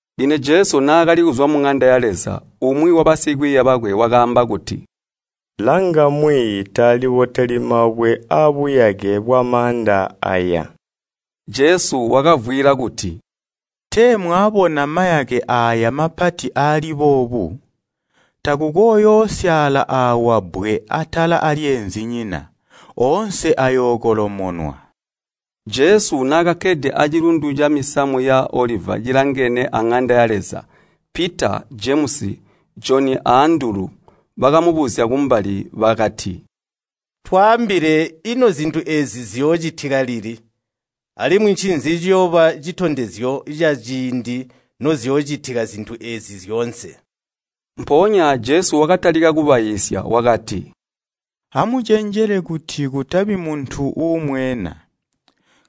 Lino Jesu naakali kuzwa muŋanda ya Leza, umwi wabasikwiiya bakwe wakaamba kuti, “Langa, Mwiiyi Taaliboteli mabwe abuyake bwamaanda eeyi!” Jesu wakavwiila kuti, “Tee mwaabona mayake aaya mapati aali boobu? Takukooyoosyaala aawa bbwe atala aalyeenzinyina. Oonse ayookolomonwa.” Jesu naakakkede acilundu camisamu ya Oliva cilangene aŋanda ya Leza, Pita, Jemusi, Joni a Andulu bakamubuzya kumbali bakati, “Twaambile ino zintu eezi ziyoocitika lili, alimwi ncinzi ciyooba citondezyo caciindi noziyoocitika zintu eezi zyoonse?” Mpoonya Jesu wakatalika kubaiisya wakati, “Amucenjele kuti kutabi muntu uumweena.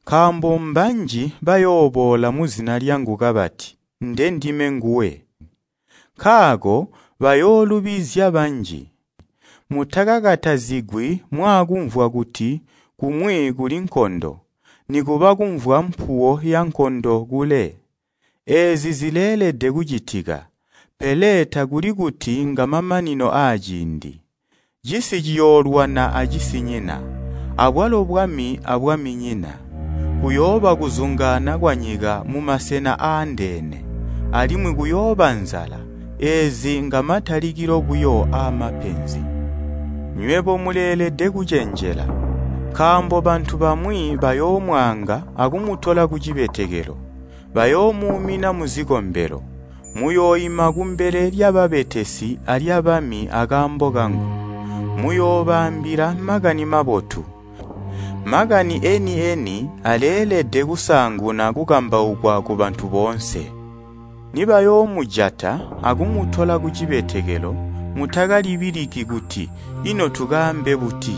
Nkaambo mbanji bayooboola muzina lyangu kabati, ‘Ndendime nguwe!’ Nkaako bayoolubizya banji. Mutakakatazigwi mwaakumvwa kuti kumwi kuli nkondo, nikuba kumvwa mpuwo yankondo kule. Eezi zileelede kucitika, pele takuli kuti ngamamanino aaciindi. Cisi ciyoolwana acisinyina, abwalo bwami abwaminyina. Kuyooba kuzungaana kwanyika mumasena aandeene, alimwi kuyooba nzala. Eezi ngamatalikilo buyo aamapenzi. “Nywebo, muleelede kucenjela, nkaambo bantu bamwi bayoomwaanga akumutola kucibetekelo. Bayoomuumina muzikombelo, muyooima kumbele lyababetesi alyabami akaambo kangu, muyoobaambila Makani Mabotu. Makani eeni-eni aleelede kusaanguna kukambaukwa kubantu boonse. Nibayoomujata akumutola kucibetekelo, mutakalibiliki kuti, ‘Ino tukaambe buti?’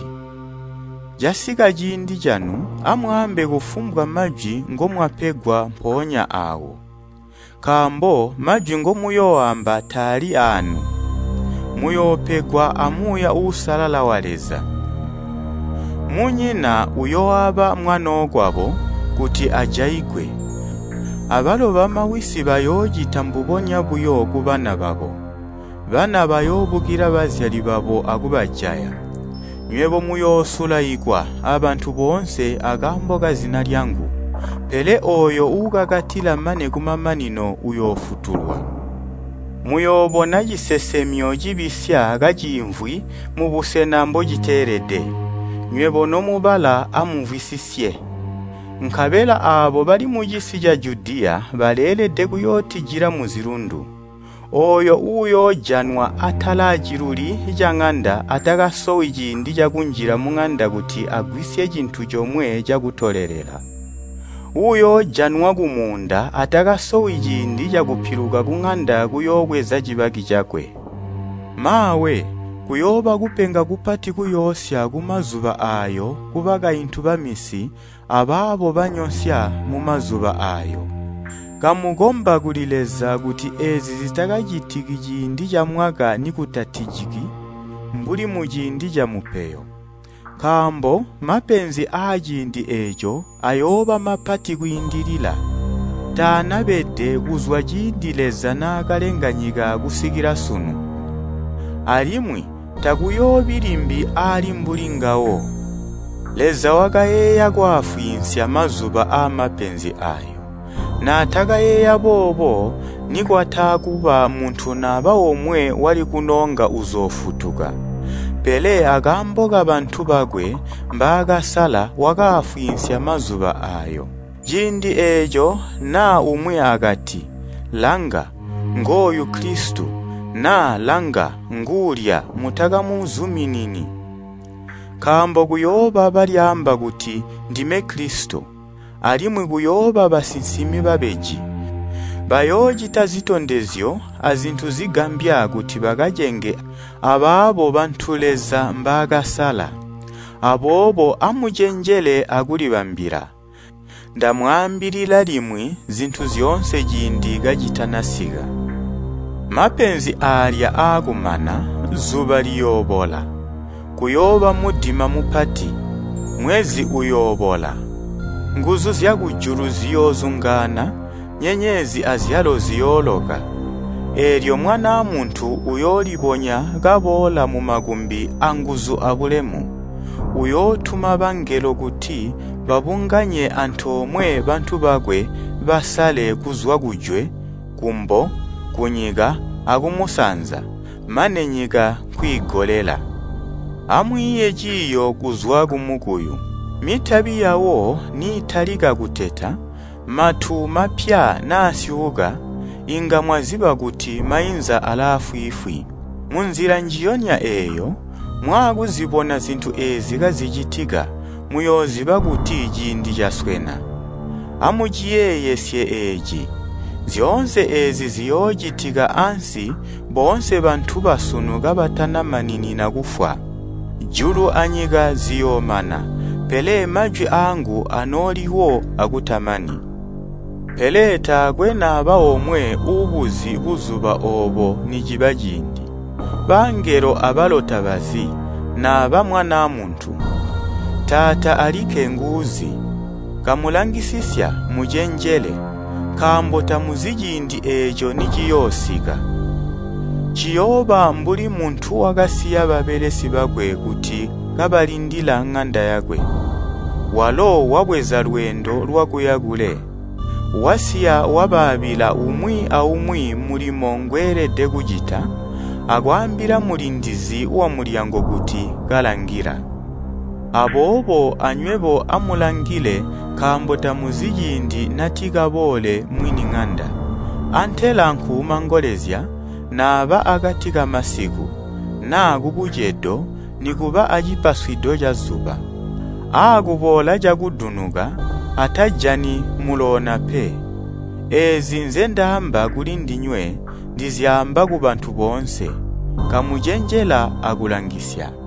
Casika ciindi canu, amwaambe kufumbwa majwi ngomwapegwa mpoonya aawo. Nkaambo majwi ngomuyooamba taali aanu, muyoopegwa a Muuuya Uusalala wa Leza. Munyina uyooaba mwanookwabo kuti ajaigwe, abalo bamawisi bayoocita mbubonya buyo kubana babo, bana bayoobukila bazyali babo akubajaya. Nywebo muyoosulaikwa abantu boonse akaambo kazina lyangu. Pele ooyo uukakatila mane kumamanino, uyoofutulwa. “Muyoobona ‘Cisesemyo cibisya’ kaciimvwi mubusena mbociteelede” (Nywebo nomubala, amumvwisisye.) “Nkabela aabo bali mucisi ca Judiya baleelede kuyootijila muzilundu. Ooyo uyoojanwa atala aciluli caŋanda atakasowi ciindi kunjila muŋanda kuti agwisye cintu comwe cakutolelela. Uyoojanwa kumuunda atakasowi ciindi cakupiluka kuŋanda kuyoobweza cibaki cakwe. Maawe! Kuyooba kupenga kupati kuyoosya kumazuba aayo kubakaintu baminsi abaabo banyonsya mumazuba aayo. Kamukomba kuli Leza kuti eezi zitakacitiki ciindi camwaka nikutatijiki mbuli muciindi camupeyo. Nkaambo mapenzi aaciindi eeco ayooba mapati kwiindilila, taanabede kuzwa ciindi Leza naakalenga nyika kusikila sunu. Alimwi takuyoobi limbi aali mbuli ngawo. Leza wakayeeya kwaafwiinsya mazuba aamapenzi aayo, naatakayeeya boobo nikwataakuba muntu naba omwe wali kunoonga uzoofutuka. Pele akaambo kabantu bakwe mbaakasala wakaafwiinsya mazuba aayo. “Ciindi eeco, naa umwi akati, ‘Langa, ngooyu Kilisito’ naa ‘Langa, nguulya’ mutakamuzuminini. Nkaambo kuyooba balyaamba kuti, ‘Ndime Kilisito’ alimwi kuyooba basinsimi babeji. Bayoocita zitondezyo azintu zigambya kuti bakacenge abaabo bantu Leza mbaakasala. Aboobo amucenjele akulibambila. Ndamwaambilila limwi zintu zyoonse ciindi kacitanasika. “Mapenzi aalya aakumana, zuba liyoobola, kuyooba mudima mupati, mwezi uyoobola. Nguzu zyakujulu ziyoozungaana, nyenyezi azyalo ziyooloka. Eelyo Mwanaa Muntu uyoolibonya kaboola mumakumbi anguzu abulemu. Uyootuma bangelo kuti babunganye antoomwe bantu bakwe basale kuzwa kujwe, kumbo, kunyika akumusanza, mane nyika nkwiigolela. “Amwiiye ciiyo kuzwa kumukuyu. Mitabi yawo niitalika kuteta, matu mapya naasyuuka inga mwaziba kuti mainza alaafwiifwi. Munzila njiyonya eeyo, mwaakuzibona zintu eezi kazicitika, muyooziba kuti ciindi caswena. Amuciyeeyesye eeci. Zyoonse eezi ziyoocitika ansi boonse bantu basunu kabatanamaninina kufwa. Julu anyika ziyoomana, pele majwi aangu anooliwo akutamani. “Pele taakwe naba omwe uubuzi buzuba oobo niciba ciindi. Bangelo abalo tabazi, naba Mwanaa Muntu, Taata alikke nguuzi. Kamulangisisya, mucenjele, nkaambo tamuzi ciindi eeco niciyoosika. Ciyooba mbuli muntu wakasiya babelesi bakwe kuti kabalindila ŋanda yakwe, walo wabweza lweendo lwakuya kule, wasiya wabaabila umwi aumwi mulimo ngweelede kucita akwaambila mulindizi wamulyango kuti kalangila. Aboobo anywebo amulangile nkaambo tamuzi ciindi natikaboole mwini ŋanda, antela nkuumangolezya naaba akati kamasiku, naa kubucedo nikuba acipaswido cazuba. Aakuboola cakudunuka, atajani muloona pe. Eezi nzendaamba kulindinywe ndizyaamba kubantu boonse. Kamucenjela akulangisya.”